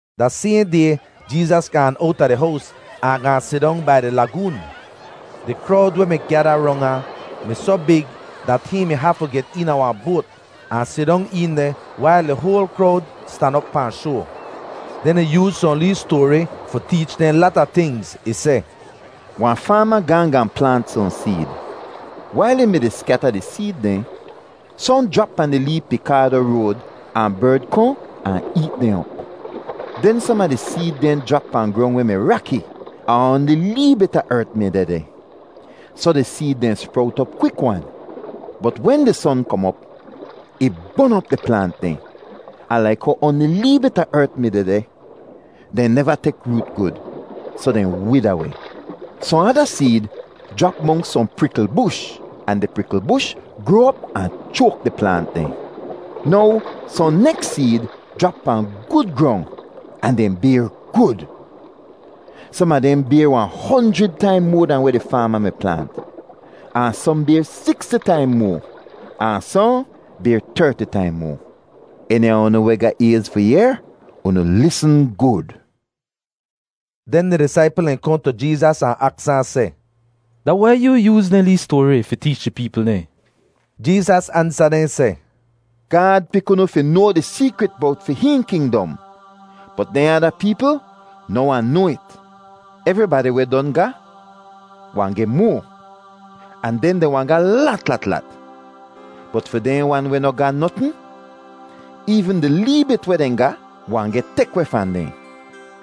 Da sayhn day Jeezas gaan owta di hows ahn gaahn sidong bai di lagoon. Di krowd weh mi gyada rong ahn mi soh big dat hihn mi hafu get eena wahn boat ahn sidong een deh wail di hoal krowd stan op pahn shoa. Den ih yooz sohn lee stoari fi teech dehn lata tingz. Ih seh, “Wahn faama gaahn gaahn plaant sohn seed. Wail ih mi-di skyata di seed dehn, sohn jrap pahn di lee pikaado road ahn berd kohn ahn eet dehn op. Den som a di seed dehn jrap pahn grong weh mi raki ahn oanli lee bit a ert mi dehdeh, soh di seed dehn sprowt op kwik-wan. Bot wen di son kom op, ih bon op di plaant dehn, ahn laik how oanli lee bit a ert mi dehdeh, dehn neva tek root gud, soh dehn wida weh. Sohn ada seed jrap monks sohn prikl bush ahn di prikl bush groa op ahn choak di plaant dehn. Now sohn neks seed jrap pahn gud grong ahn dehn bayr gud. Som a dehn bayr wahn honjrid taim moa dahn weh di faama mi plaant, ahn sohn bayr siksti taim moa, ahn sohn bayr terti taim moa. Eni a unu weh ga ayz fi yehr, unu lisn gud!” Den di disaipl dehn kohn tu Jeezas ahn aks ahn seh, “Da wai yoo yooz dehn lee stoari fi teech di peepl dehn?” Jeezas ansa dehn seh, “Gaad pik unu fi noa di seekrit bowt fi hihn kingdom, bot dehn ada peepl noh wahn noa it. Evribadi weh don ga, wahn geh moa, ahn den dehn wahn ga lat lat lat, bot fi dehn wan weh noh ga notn, eevn di lee bit weh dehn ga wahn geh tek weh fahn dehn.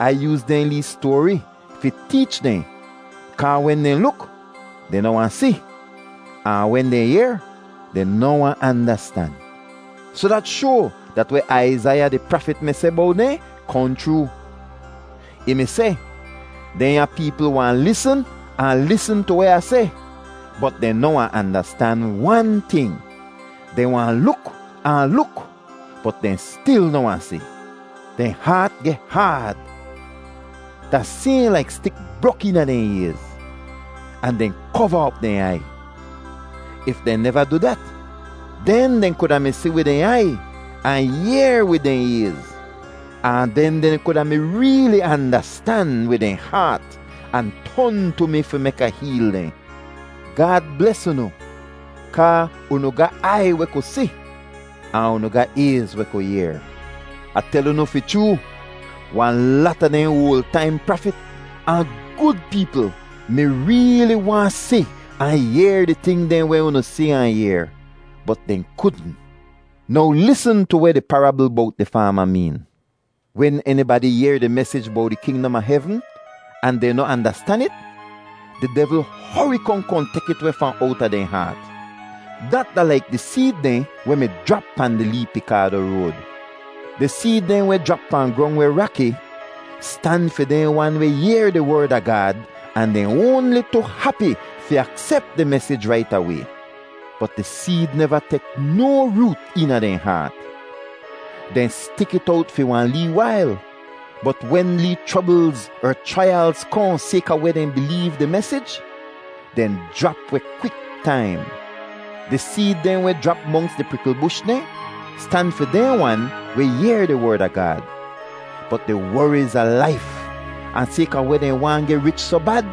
Ai yooz dehn lee stoari fi teech dehn kaa wen dehn luk, dehn noh wahn si, ahn wen dehn yehr, dehn noh wahn andastan. Soh dat shoa dat weh Aizaiya di prafit mi seh bowt dehn kohn chroo. Ih mi seh, ‘Dehnya peepl wahn lisn ahn lisn tu weh Ah seh, bot dehn noh wahn andastan wan ting. Dehn wahn luk ahn luk bot dehn stil noh wahn si. Dehn haat geh haad, da sayhn laik stik brok eena dehn ayz, ahn dehn kova op dehn aiy. If dehn neva du dat, den dehn kuda mi si wid dehn aiy, ahn yehr wid dehn ayz. Ahn den dehn kuda mi reeli andastan wid dehn haat ahn ton tu mi fi mek Ah heel dehn.’ “Gaad bles unu kaa unu ga aiy weh ku si, ahn unu ga ayz weh ku yehr! Ah tel unu fi chroo, wahn lata dehn oal taim prafit ahn gud peepl mi reeli waahn si ahn yehr di ting dehn weh unu si ahn yehr, bot dehn kudn.” “Now lisn tu weh di parabl bowt di faama meen. Wen enibadi yehr di mesij bowt di kingdom a hevn ahn dehn noh andastan it, di devl hori kohn kohn tek it weh fahn owta dehn haat. Dat da laik di seed dehn weh mi jrap pahn di lee pikaado road. Di seed dehn weh jrap pahn grong weh raki stan fi dehn wan weh yehr di Werd a Gaad ahn dehn oanli tu hapi fi aksep di mesij rait away. Bot di seed neva tek no root eena dehn haat. Dehn stik it owt fi wahn lee wail, bot wen lee chroblz er chraiyalz kohn sayka weh dehn bileev di mesij, dehn jrap weh kwik-taim. Di seed dehn weh jrap monks di prikl bush dehn stan fi dehn wan weh yehr di Werd a Gaad, bot di woriz a laif ahn sayka weh dehn waahn geh rich soh bad,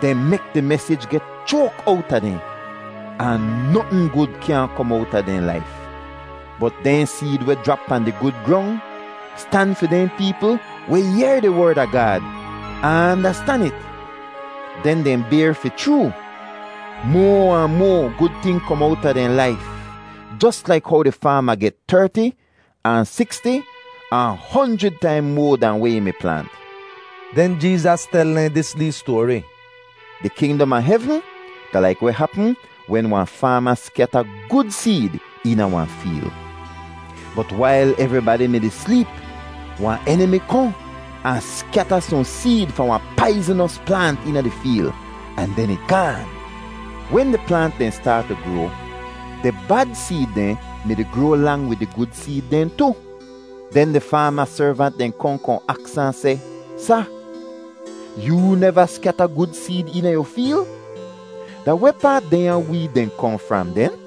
dehn mek di mesij geh choak owta dehn, ahn notn gud kyaahn kom owta dehn laif. Bot dehn seed weh jrap pahn di gud grong stan fi dehn peepl weh yehr di Werd a Gaad ahn andastan it. Den dehn bayr fi chroo—moa ahn moa gud ting kom owta dehn laif, jos laik how di faama geh terti ahn siksti ahn honjrid taim moa dahn weh ih mi plaant.” Den Jeezas tel dehn dis lee stoari: “Di kingdom a hevn da laik weh hapm wen wahn faama skyata gud seed eena wahn feel. Bot wail evribadi mi-di sleep, wahn enimi kohn ahn skyata sohn seed fahn wahn paiznos plaant eena di feel, ahn den ih gaan. Wen di plaant dehn staat tu groa, di bad seed dehn mi-di groa lang wid di gud seed dehn tu. Den di faama servant dehn kohn kohn aks ahn seh, ‘Sa, yoo neva skyata gud seed eena yu feel? Da wehpaa dehnya weed dehn kohn fram, den?’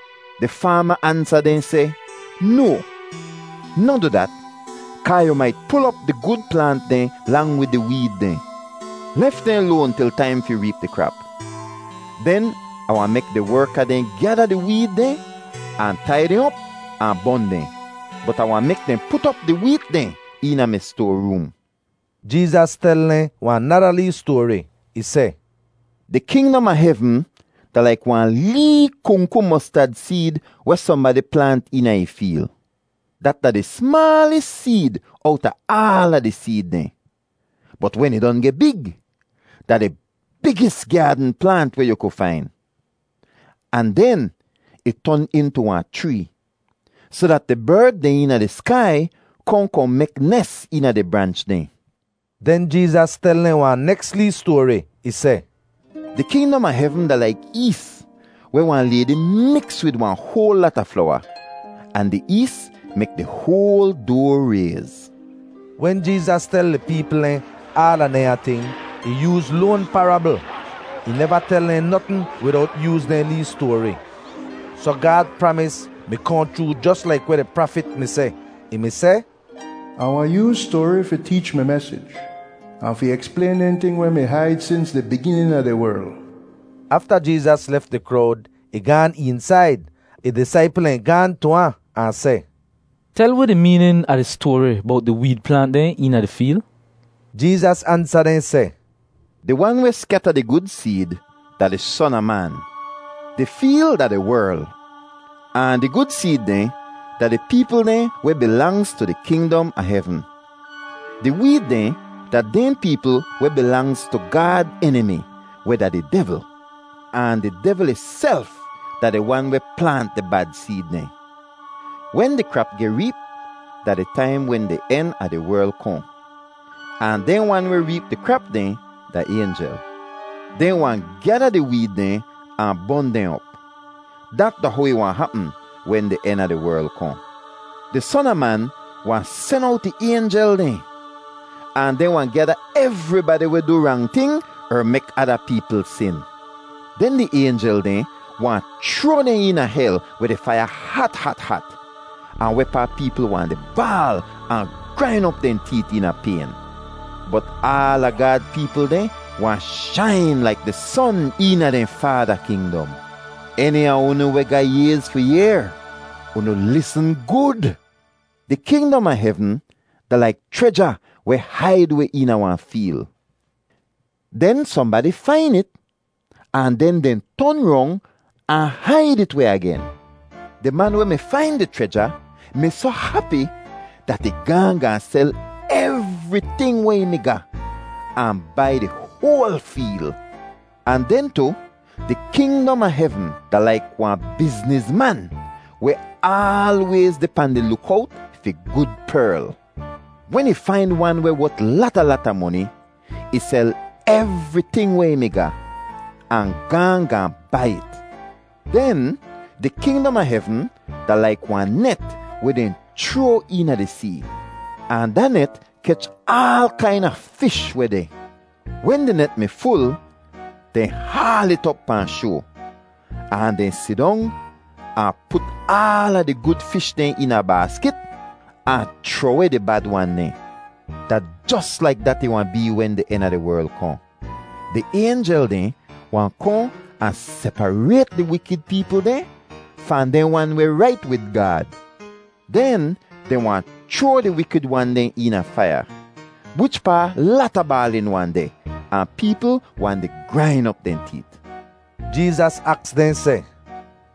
“Di faama ansa dehn seh, ‘No, noh du dat, kaa yu mait pul op di gud plaant dehn lang wid di weed dehn. Lef dehn loan til taim fi reep di krap. Den Ah wahn mek di werka dehn gyada di weed dehn ahn tai dehn op ahn bon dehn. Bot Ah wahn mek dehn put op di weet dehn eena mi stoaroom.’” Jeezas tel dehn wahn nada lee stoari. Ih seh, “Di kingdom a hevn da laik wahn lee kungku mostad seed weh sohnbadi plaant eena ih feel. Dat da di smaalis seed owta aala di seed dehn, bot wen ih don geh big, da di bigis gyaadn plaant weh yu ku fain, ahn den ih ton intu wahn chree, soh dat di berd dehn eena di skai kohn kohn mek nes eena di branch dehn.” Den Jeezas tel dehn wahn neks lee stoari. Ih seh, “Di kingdom a hevn da laik ees weh wahn laydi miks wid wahn hoal lata flowa ahn di ees mek di hoal doa rayz.” Wen Jeezas tel di peepl dehn aala dehnya ting, ih yooz loan parabl. Ih neva tel dehn notn widowt yooz dehn lee stoari. Soh Gaad pramis mi kohn chroo jos laik weh di prafit mi seh. Ih mi seh, “Ah wahn yooz stoari fi teech mi mesij, ahn fi eksplayn dehn ting weh mi haid sins di biginin a di werl.” Afta Jeezas lef di krowd, ih gaan eensaid. Ih disaipl dehn gaahn tu ahn, ahn seh, “Tel wi di meenin a di stoari bowt di weed plaant dehn eena di feel.” Jeezas ansa dehn seh, “Di wan weh skyata di gud seed da di Son a Man. Di feel da di werl ahn di gud seed dehn da di peepl dehn weh bilangz tu di kingdom a hevn. Di weed dehn da dehn peepl weh bilangz tu Gaad enimi, weh da di devl. Ahn di devl ihself da di wan weh plaant di bad seed dehn. Wen di krap geh reep da di taim wen di en a di werl kohn, ahn dehn wan weh reep di krap dehn da aynjel. “Dehn wahn gyada di weed dehn ahn bon dehn op. Dat da how ih wahn hapm wen di en a di werl kohn. Di Son a Man wahn sen owt ih aynjel dehn, ahn dehn wahn gyada evribadi weh du rang ting er mek ada peepl sin. Den di aynjel dehn wahn chroa dehn eena hel weh di faiya hat hat hat, ahn wehpaa peepl wahn di baal ahn grain op dehn teet eena payn. Bot aala Gaad peepl dehn wahn shain laik di son eena dehn Faada kingdom. Eni a unu weh ga ayz fi yehr, unu lisn gud! “Di kingdom a hevn da laik chreja weh haid weh eena wahn feel. Den sohnbadi fain it ahn den dehn ton rong ahn haid it weh agen. Di man weh mi fain di chreja mi soh hapi dat ih gaahn gaahn sel evriting weh ih mi ga ahn bai di hoal feel. “Ahn den tu, di kingdom a hevn da laik wahn biznizman weh aalwayz deh pahn di lukowt fi gud perl. Wen ih fain wan weh wot lata lata moni, ih sel evriting weh ih mi ga ahn gaahn gaahn bai it. “Den di kingdom a hevn da laik wahn net weh dehn chroa eena di see, ahn da net kech aal kaina fish weh deh. Wen di net mi ful, dehn haal it op pahn shoa, ahn dehn sidong ahn put aala di gud fish dehn eena baaskit ahn chroh-weh di bad wan dehn. Da jos laik dat ih wahn bee wen di en a di werl kohn. Di aynjel dehn wahn kohn ahn separayt di wikid peepl dehn fahn dehn wan weh rait wid Gaad. Den dehn wahn chroa di wikid wan dehn eena faiya wichpaa lata baalin wahn deh, ahn peepl wahn di grain op dehn teet.” Jeezas aks dehn seh,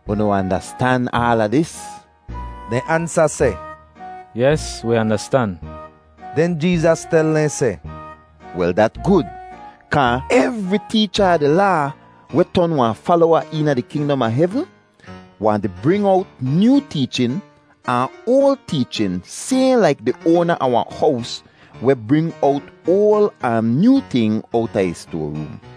“Unu andastan aala dis?” Dehn ansa seh, “Yes, wi andastan.” Den Jeezas tel dehn seh, “Wel dat gud, kaa evri teecha a di Laa weh ton wahn falowa eena di kingdom a hevn wahn di bring owt nyoo teechin ahn oal teechin sayhn laik di oana a wahn hows weh bring owt oal ahn nyoo ting owta ih stoaroom.”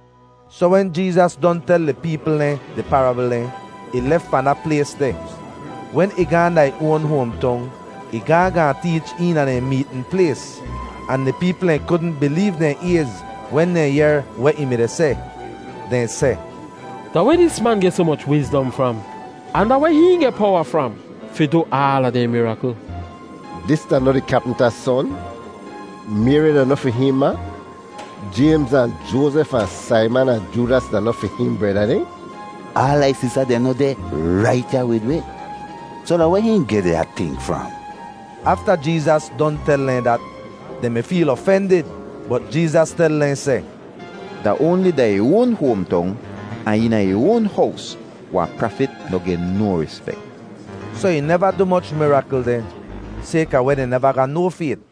Soh wen Jeezas don tel di peepl dehn di parabl dehn, ih lef fahn da plays deh. Wen ih gaahn da ih oan hoamtong, ih gaahn gaahn teech eena dehn meetn plays, ahn di peepl dehn kudn bileev dehn ayz wen dehn yehr weh ih mi-di seh. Dehn seh, “Da weh dis man geh soh moch wizdom fram? Ahn da weh hihn geh powa fram fi du aala dehn mirakl? Dis da noh di kyapmta son? Mayri da noh fi hihn ma? Jaymz ahn Joazef ahn Saiman ahn Joodas da noh fi hihn breda dehn? Aala ih sista dehn noh deh rait ya wid wi? Soh da weh hihn geh dehnya ting fram?” Afta Jeezas don tel dehn dat, dehn mi feel ofendid. Bot Jeezas tel dehn seh, “Da oanli da ih oan hoamtong ahn eena ih oan hows wahn prafit noh geh no rispek.” Soh ih neva du moch mirakl deh sayka weh dehn neva ga no fayt.